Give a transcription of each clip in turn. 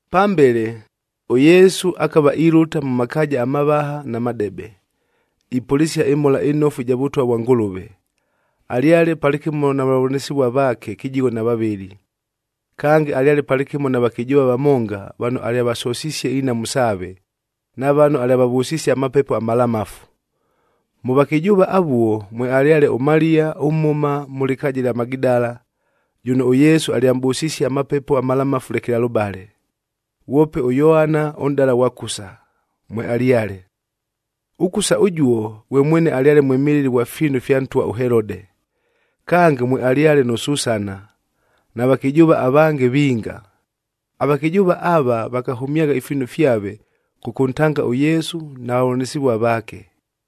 Pambele, ʉYesu akava ilʉta mʉ makaaja amavaha na madebe, ipʉlɨsia ɨMhola ɨNofu ɨja Vʉtwa vwa Ngʉlʉve. Alyale palɨkɨmo na vavʉlanɨsɨvua vaake kɨjigho na vavɨlɨ. Kange, alyale palɨkɨmo na vakɨjʉʉva vamonga vano alyavasosisie inhamu saave, na vano alyavavʉsisie amapepo amalamafu. Mʉ vakɨjʉʉva avuo, mwealyale ʉMaliya ʉmhʉma mʉ lɨkaaja ɨlya Magidala, jʉno ʉYesu alyamʼbʉsisie amapepo amalamafu lekelalʉbale. Ghwope ʉYoana ʉnʼdala ghwa Kusa, mwealyale. ɄKusa ʉjuo, ghwe mwene alyale mwɨmɨlɨli ghwa fiinu fya ntwa ʉHelode. Kange, mwealyale nʉ Susana, na vakɨjʉʉva avange vinga. Avakɨjʉʉva ava vakahʉmyagha ifiinu fyave, kʉkʉntanga ʉYesu na vavʉlanɨsɨvua vaake.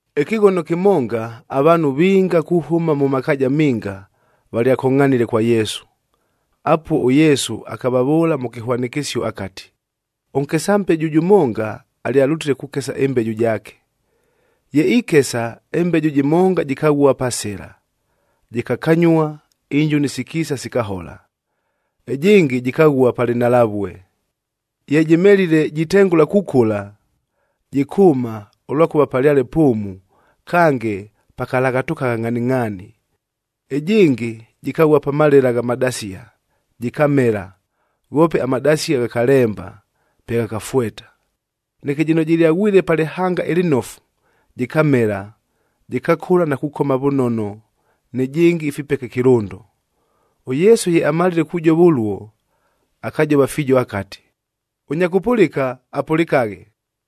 Ɨkɨghono kɨmonga, avaanhu vinga kuhʉma mʉ makaaja minga, valyakongʼhanile kwa Yesu. Apuo ʉYesu akavavʉʉla mʉ kɨhwanɨkɨsio akati, “Ʉnkesa mbeju jʉmonga alyalʉtile kukesa ɨmbeju jaake. Ye ikesa, ɨmbeju jɨmonga jɨkaghua pa sɨla, jɨkakanyua, injuni sikiisa sikahola. Ɨjɨngɨ, jɨkaghua pa lɨnhalavue. Ye jɨmelile jitengʉla kukʉla, jɨkʉʉma, ʉlwakʉva palyale pʉʉmu kange pakalaghatʉkagha ngʼhaningʼhaani. Ɨjɨngɨ, jɨkaghua pa malela gha madasia, jɨkamela, ghoope amadasia ghakalemba, pe ghakafweta. Neke jɨno jɨlyaghwile pa lɨhanga ɨlɨnofu, jɨkamela, jɨkakʉla na kukoma vʉnono nɨjɨngɨ ifipeke kɨlʉndo!” ɄYesu ye amalile kujova ʉluo, akajova fiijo akati, “Ʉnya kʉpʉlɨka, apʉlɨkaghe!”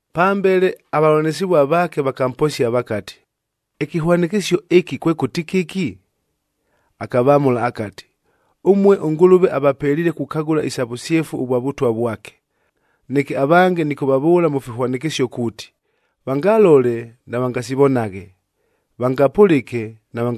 Pambele avavʉlanɨsɨvua vaake vakamposia vakati, “Ɨkɨhwanɨkɨsio ɨkɨ kwekʉti kɨki?” Akavamʉla akati, “Ʉmue ʉNgʉlʉve avapeliile kukagʉla isa vʉsyefu ʉvwa Vʉtwa vwake. Neke avange nɨkʉvavʉʉla mʉ fihwanɨkɨsio kuuti, ‘Vangalole, navangasivonaghe. Vangapʉlɨke,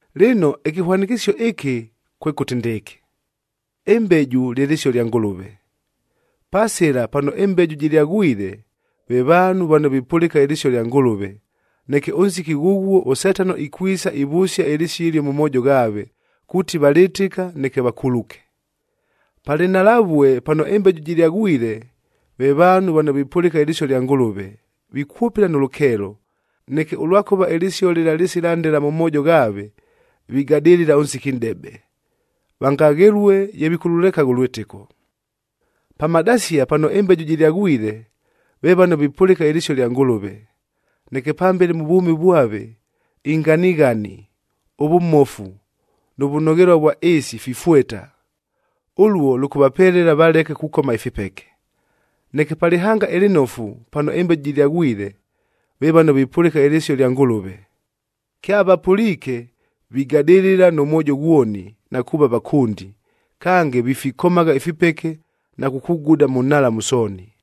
“Lɨno, ɨkɨhwanɨkɨsio ɨkɨ kwekʉti ndɨɨkɨ: Ɨmbeju lye lɨsio lya Ngʉlʉve. Pa sɨla pano ɨmbeju jɨlyaghwile, ve vaanhu vano vipʉlɨka ɨlɨsio lya Ngʉlʉve, neke ʉnsiki ghʉghuo, ʉSetano ikwisa ivʉsia ɨlɨsio ɨlio mʉ moojo ghaave, kuuti valɨtɨka neke vakuluke. Pa lɨnhalavue pano ɨmbeju jɨlyaghwile, ve vaanhu vano vipʉlɨka ɨlɨsio lya Ngʉlʉve, vikwʉpɨla nʉ lʉkeelo, neke ʉlwakʉva ɨlɨsio lɨla lɨsila ndela mʉ moojo ghaave, vigadɨlɨla ʉnsiki nʼdebe, vangaghelue ye vikʉlʉlekagha ʉlwɨtɨko. Pa madasia pano ɨmbeju jɨlyaghwile, ve vano vipʉlɨka ɨlɨsio lya Ngʉlʉve, neke pambele mʉ vwʉmi vwave inganighani, ʉvʉmofu, nʉ vʉnoghelua vwa ɨɨsi fifweta. Ʉluo lʉkʉvapelela valeke kukoma ifipeke. Neke pa lɨhanga ɨlɨnofu pano ɨmbeju jɨlyaghwile, ve vano vipʉlɨka ɨlɨsio lya Ngʉlʉve. Kyavapʉliike, vigadɨlɨla nʉ mwojo ghwoni na kuuva vakʉndi, kange vifikomagha ifipeke na kukuguda mʉ nhalamu sooni.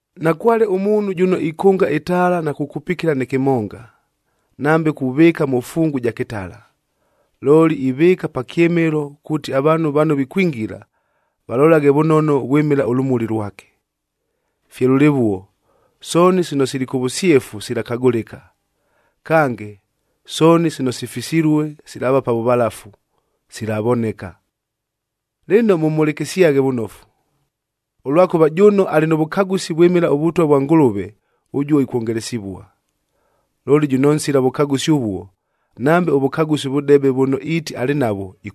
“Nakwale ʉmuunhu jʉno ikʉnga ɨtaala na kukupikila nɨ kɨmonga, nambe kuvɨɨka mʉ fungu ja kɨtala. Looli, ivɨɨka pa kyɨmɨlo kuuti avaanhu vano vikwingila, valolaghe vʉnono vwɨmɨla ʉlʉmuli lwake. Fye lʉlɨvuo, sooni sino sili kʉ vʉsyefu silakagʉlɨka. Kange, sooni sino sifisilue, silaava pa vʉvalafu, silavoneka. “Lɨno, mʉmhʉlɨkɨsyaghe vʉnofu! Ʉlwakʉva, jʉno alɨ nʉ vʉkagʉsi vwɨmɨla ʉVʉtwa vwa Ngʉlʉve ʉjuo ikwongelesivua. Looli jʉno nsila vʉkagʉsi ʉvuo, nambe ʉvʉkagʉsi ʉvʉdebe vʉno iiti alɨ navwo,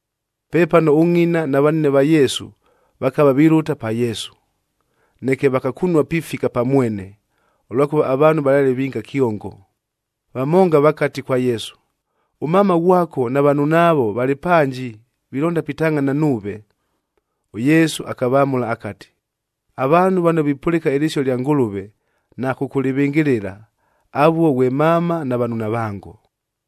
Pepano ʉngʼina na vanine va Yesu, vakava vilʉta pa Yesu. Neke vakakunua pifika pa mwene, ʉlwakʉva avaanhu valyale vinga kyongo. Vamonga vakati kwa Yesu, “Ʉmama ghwako na vanunaavo valɨ panji vilonda pitangʼhana nuuve.” ɄYesu akavamʉla akati, “Avaanhu vano vipʉlɨka ɨlɨsio lya Ngʉlʉve na kʉkʉlɨvɨngɨlɨla, avuo ghwe mama na vanunavango.”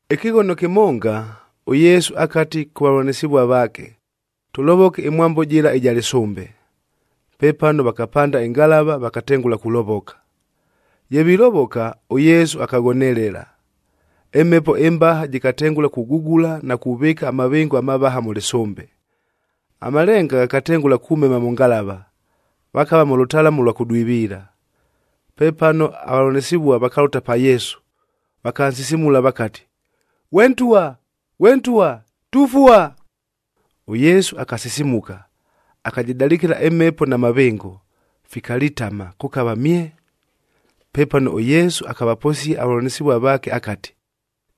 Ɨkɨghono kɨmonga, ʉYesu akati kʉ vavʉlanɨsɨvua vaake, “Tʉlovoke ɨmwambo jɨla ɨja lɨsʉmbe.” Pepano, vakapanda ɨngalava vakatengʉla kulovoka. Ye vilovoka, ʉYesu akaghonelela. Ɨmhepo ɨmbaha jɨkatengʉla kugugula na kuvɨɨka amavɨngo amavaha mʉ lɨsʉmbe. Amalenga ghakatengʉla kumema mʉ ngalava, vakava mʉ lʉtalamu ʉlwa kʉdwiviila. Pepano avavʉlanɨsɨvua vakalʉta pa Yesu, vakansisimula vakati, “Ghwe Ntwa! Ghwe Ntwa! Tufua!” ɄYesu akasisimuka, akajɨdalɨkɨla ɨmhepo na mavɨngo, fikalitama, kʉkava mye! Pepano ʉYesu akavaposia avavʉlanɨsɨvua vaake akati,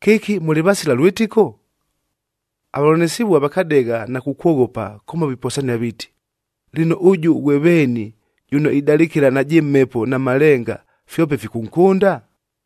“Kɨki mʉlɨ vasila lwɨtɨko?” Avavʉlanɨsɨvua vakadegha na kukwoghopa kʉmo viposania viiti, “Lɨno, ʉjʉ ghwe veeni, jʉno idalɨkɨla najɨ mhepo na malenga, fyope fikʉnkʉnda?”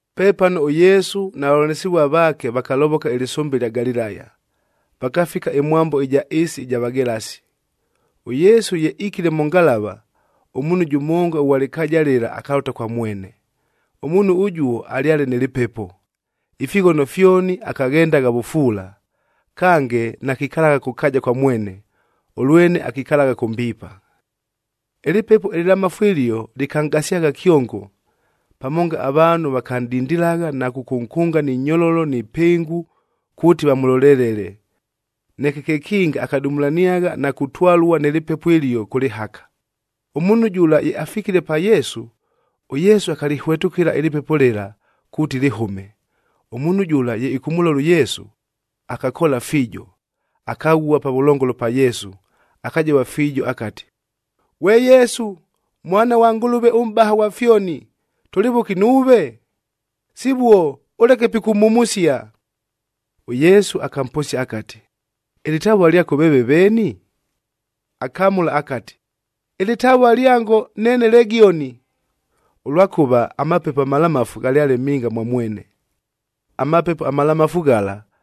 Pepano ʉYesu na vavʉlanɨsɨvua vaake, vakalovoka ɨlɨsʉmbe ɨlya Galilaya, vakafika ɨmwambo ɨja ɨɨsi ɨja Vagelasi. ɄYesu ye ikile mʉ ngalava, ʉmuunhu jʉmonga ʉghwa lɨkaaja lɨla akalʉta kwa mwene. Ʉmuunhu ʉjuo alyale nɨ lɨpepo. Ifighono fyoni akaghendagha vʉfuula, kange nakikalagha kʉ kaaja kwa mwene, ʉlwene akikalagha kʉ mbiipa. Ɨlɨpepo ɨlɨlamafu ɨlio, lɨkanʼgasyagha kyongo. Pamonga avaanhu vakanʼdindilagha na kʉkʉnkʉnga ni nyololo ni pɨngu kuuti vamʉlolelele, neke kekinga akadumulaniagha na kutwalua nɨ lɨpepo ɨlio kʉ lɨhaka. Ʉmuunhu jʉla ye afikile pa Yesu, ʉYesu akalɨhwetʉkɨla ɨlɨpepo lɨla, kuuti lɨhʉme. Ʉmuunhu jʉla ye ɨkʉmʉlola ʉYesu, akakoola fiijo. Akaghua pavʉlongolo pa Yesu akajova fiijo akati, “Ghwe Yesu, Mwana ghwa Ngʉlʉve ʉMʼbaha ghwa fyoni, tʉlɨ vʉki nuuve? Sivuo, ʉleke pikʉmhumusia.” ɄYesu akamposia akati, “Ɨlɨtavua lyako veeve veeni?” Akamʉla akati, “Ɨlɨtavua lyango neene Legioni.”c Ʉlwakʉva amapepo amalamafu ghalyale minga mwa mwene. Amapepo amalamafu ghala,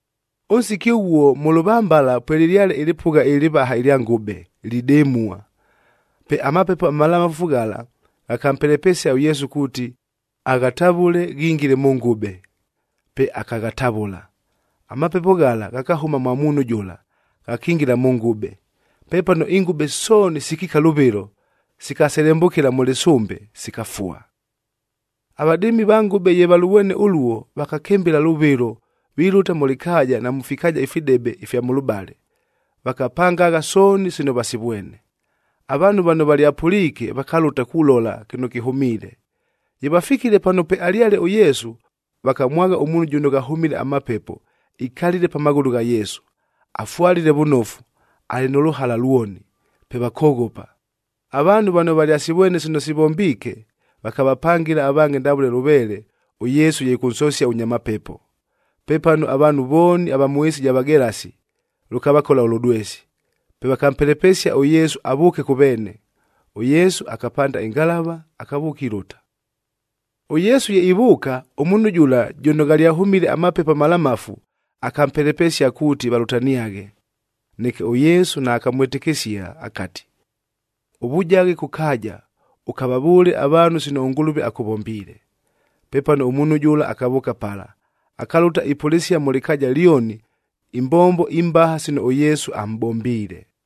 Ʉnsiki ʉghuo mʉ lʉvambala pwelɨlyale ɨlɨpʉgha ɨlɨvaha ɨlya ngʉbe, lidɨmua. Pe amapepo amalamafu ghala, ghakampelepesia ʉYesu kuuti, aghatavʉle ghingile mʉ ngʉbe. Pe akaghatavʉla. Amapepo ghala ghakahʉma mwa muunhu jʉla, ghakingila mʉ ngʉbe. Pepano ingʉbe sooni sikiika lʉvɨlo, sikaselembʉkɨla mʉ lɨsʉmbe, sikafua. Avadɨɨmi va ngʉbe ye valʉvwene ʉluo, vakakɨmbɨla lʉvɨlo vilʉta mʉ lɨkaaja na mʉ fikaaja ifidebe ifya mʉlʉbale, vakapangagha sooni sino vasivwene. Avaanhu vano valyapʉliike, vakalʉta kulola kɨno kɨhʉmiile. Ye vafikile pano pwealyale ʉYesu, vakamwagha ʉmuunhu jʉno ghahʉmile amapepo ikalile pa maghʉlʉ gha Yesu, afwalile vʉnofu, alɨ nʉ lʉhala lwoni, pe vakoghopa. Avaanhu vano valyasivwene sino sivombiike, vakavapangɨla avange ndavʉle lʉveele, ʉYesu ye ɨkʉnsosia ʉnya mapepo. Pepano avaanhu vooni ava mʉ ɨɨsi ɨja Vagelasi, lʉkavakola ʉlʉdwesi. Pe vakampelepesia ʉYesu avʉʉke kʉ veene. ɄYesu akapanda ɨngalava, akavʉʉka ilʉta. ɄYesu ye ivʉʉka, ʉmuunhu jʉla jʉno ghalyahʉmile amapepo amalamafu, akampelepesia kuuti valʉtaniaghe. Neke ʉYesu naakamwɨtɨkɨsia akati, “Ʉvujaghe kʉ kaaja, ʉkavavʉʉle avaanhu sino ʉNgʉlʉve akʉvombiile.” Pepano ʉmuunhu jʉla akavʉʉka pala, akalʉta ipʉlɨsia mʉ lɨkaaja lyoni imbombo imbaha sino ʉYesu amʼbombiile.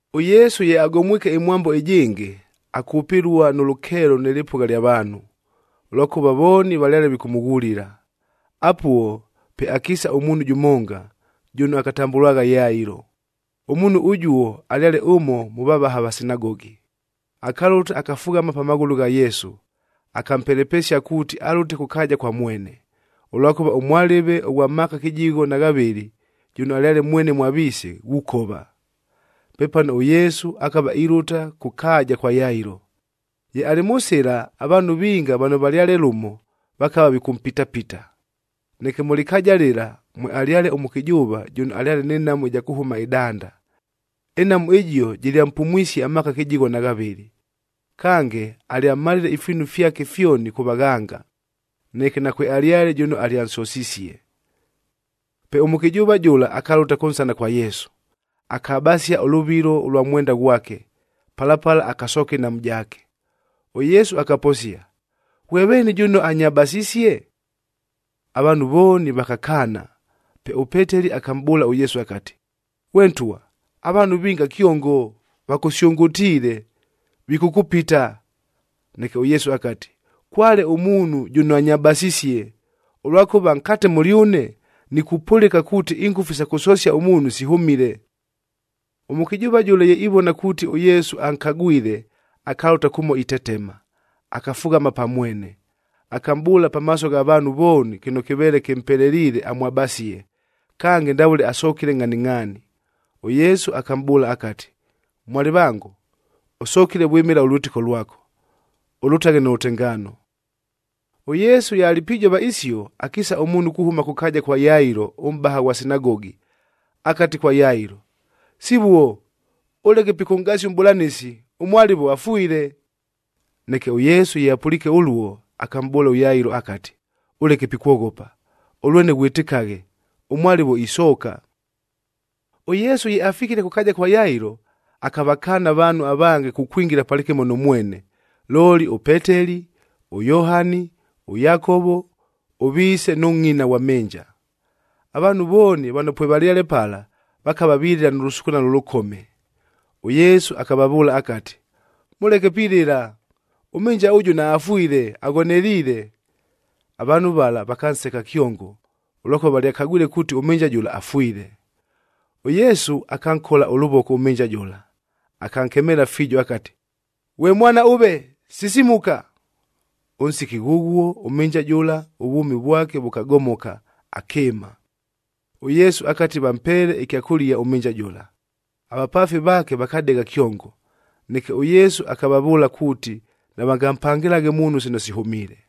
ɄYesu ye agomwike ɨmwambo ɨjɨngɨ, akʉpɨlua nʉ lʉkeelo nɨ lɨpʉgha ɨlya vaanhu, ʉlwakʉva vooni valyale vikʉmʉghulila. Apuo, pe akiisa ʉmuunhu jʉmonga, jʉno akatambʉlwagha Yailo. Ʉmuunhu ʉjuo alyale ʉmo mʉ vavaha va sinagogi. Akalʉta akafughama pa maghʉlʉ gha Yesu, akampelepesia kuuti alʉte kʉ kaaja kwa mwene, ʉlwakʉva ʉmwalɨve ʉghwa maaka kɨjigho na ghavɨlɨ, jʉno alyale mwene mwa viise, ghukova. Pepano ʉYesu akava ilʉta kʉ kaaja kwa Yailo. Ye alɨ mʉ sɨla, avaanhu vinga vano valyale lʉmo, vakava vikʉmpitapita. Neke mʉ lɨpʉgha lɨla, mwealyale ʉmʉkɨjʉʉva, jʉno alyale nɨ nhamu ɨja kʉhʉma ɨdanda. Ɨnhamu ɨjio jɨlyampumwisie amaaka kɨjigho na ghavɨlɨ. Kange, alyamalile ifiinu fyake fyoni kʉ vaghanga,e neke nakwealyale jʉno alyansosisie. Pe ʉmʉkɨjʉʉva jʉla akalʉta kʉnsana kwa Yesu, akabasia ʉlʉvilo ʉlwa mwenda ghwake, pala pala akasooka ɨnhamu jaake. ɄYesu akaposia, “Ghwe veeni jʉno anyabasisie?” Avaanhu vooni vakakaana. Pe ʉPeteli akamʼbʉʉla ʉYesu akati, “Ghwe Ntwa, avaanhu vinga kyongo vakʉsyʉngʉtiile, vikʉkʉpita!” Neke ʉYesu akati, “Kwale ʉmuunhu jʉno anyabasisie, ʉlwakʉva nkate mʉlyʉne, nikupʉlɨka kuuti ingʉfu isa kʉsosia ʉmuunhu sihʉmile.” Ʉmʉkɨjʉʉva jʉla ye ivona kuuti ʉYesu ankagwile, akalʉta kʉmo itetema.f Akafughama pa mwene, akamʼbʉʉla pamaaso gha vaanhu vooni kɨno kɨveele kɨmpeleliile amwabasie, kange ndavʉle asokile ngʼhaningʼhaani. ɄYesu akamʼbʉʉla akati, “Mwalɨvango, ʉsokile vwɨmɨla ʉlwɨtɨko lwako. Ʉlʉtaghe nʉ lʉtengaano!” ɄYesu ye alɨ pijova isio, akiisa ʉmuunhu kuhʉma kʉ kaaja kwa Yailo ʉmʼbaha ghwa sinagogi, akati kwa Yailo, “Sivuo, ʉleke pikʉnʼgasia ʉMʼbʉlanɨsi, ʉmwalɨvo afwile.” Neke ʉYesu ye apʉliike ʉluo, akamʼbʉʉla ʉYailo akati, “Ʉleke pikwoghopa, ʉlwene ghwɨtɨkaghe. Ʉmwalɨvo isooka.” ɄYesu ye afikile kʉ kaaja kwa Yailo, akavakaana avaanhu avange kukwingila palɨkɨmo nʉ mwene, looli ʉPeteli, ʉYohani, ʉYakovo, ʉviise nʉ ngʼina ghwa mhɨnja. Avaanhu vooni vano pwevalyale pala, vakava vilɨla nʉ lʉsukunalo ʉlʉkome. ɄYesu akavavʉʉla akati, “Mʉleke pilɨla! Ʉmhɨnja ʉjʉ naafwile, aghoneliile.” Avaanhu vala vakanseka kyongo, ʉlwakʉva valyakagwile kuuti ʉmhɨnja jʉla afwile. ɄYesu, akankola ʉlʉvoko ʉmhɨnja jʉla, akankemeela fiijo akati, “Ghwe mwana ʉve, sisimuka!” Ʉnsiki ghʉghuo, ʉmhɨnja jʉla, ʉvwʉmi vwake vʉkagomoka, akɨɨma. ɄYesu akati vampeele ɨkyakʉlia ʉmhɨnja jʉla. Avapaafi vaake vakadegha kyongo. Neke ʉYesu akavavʉʉla kuuti navangampangɨlaghe muunhu sino sihʉmiile.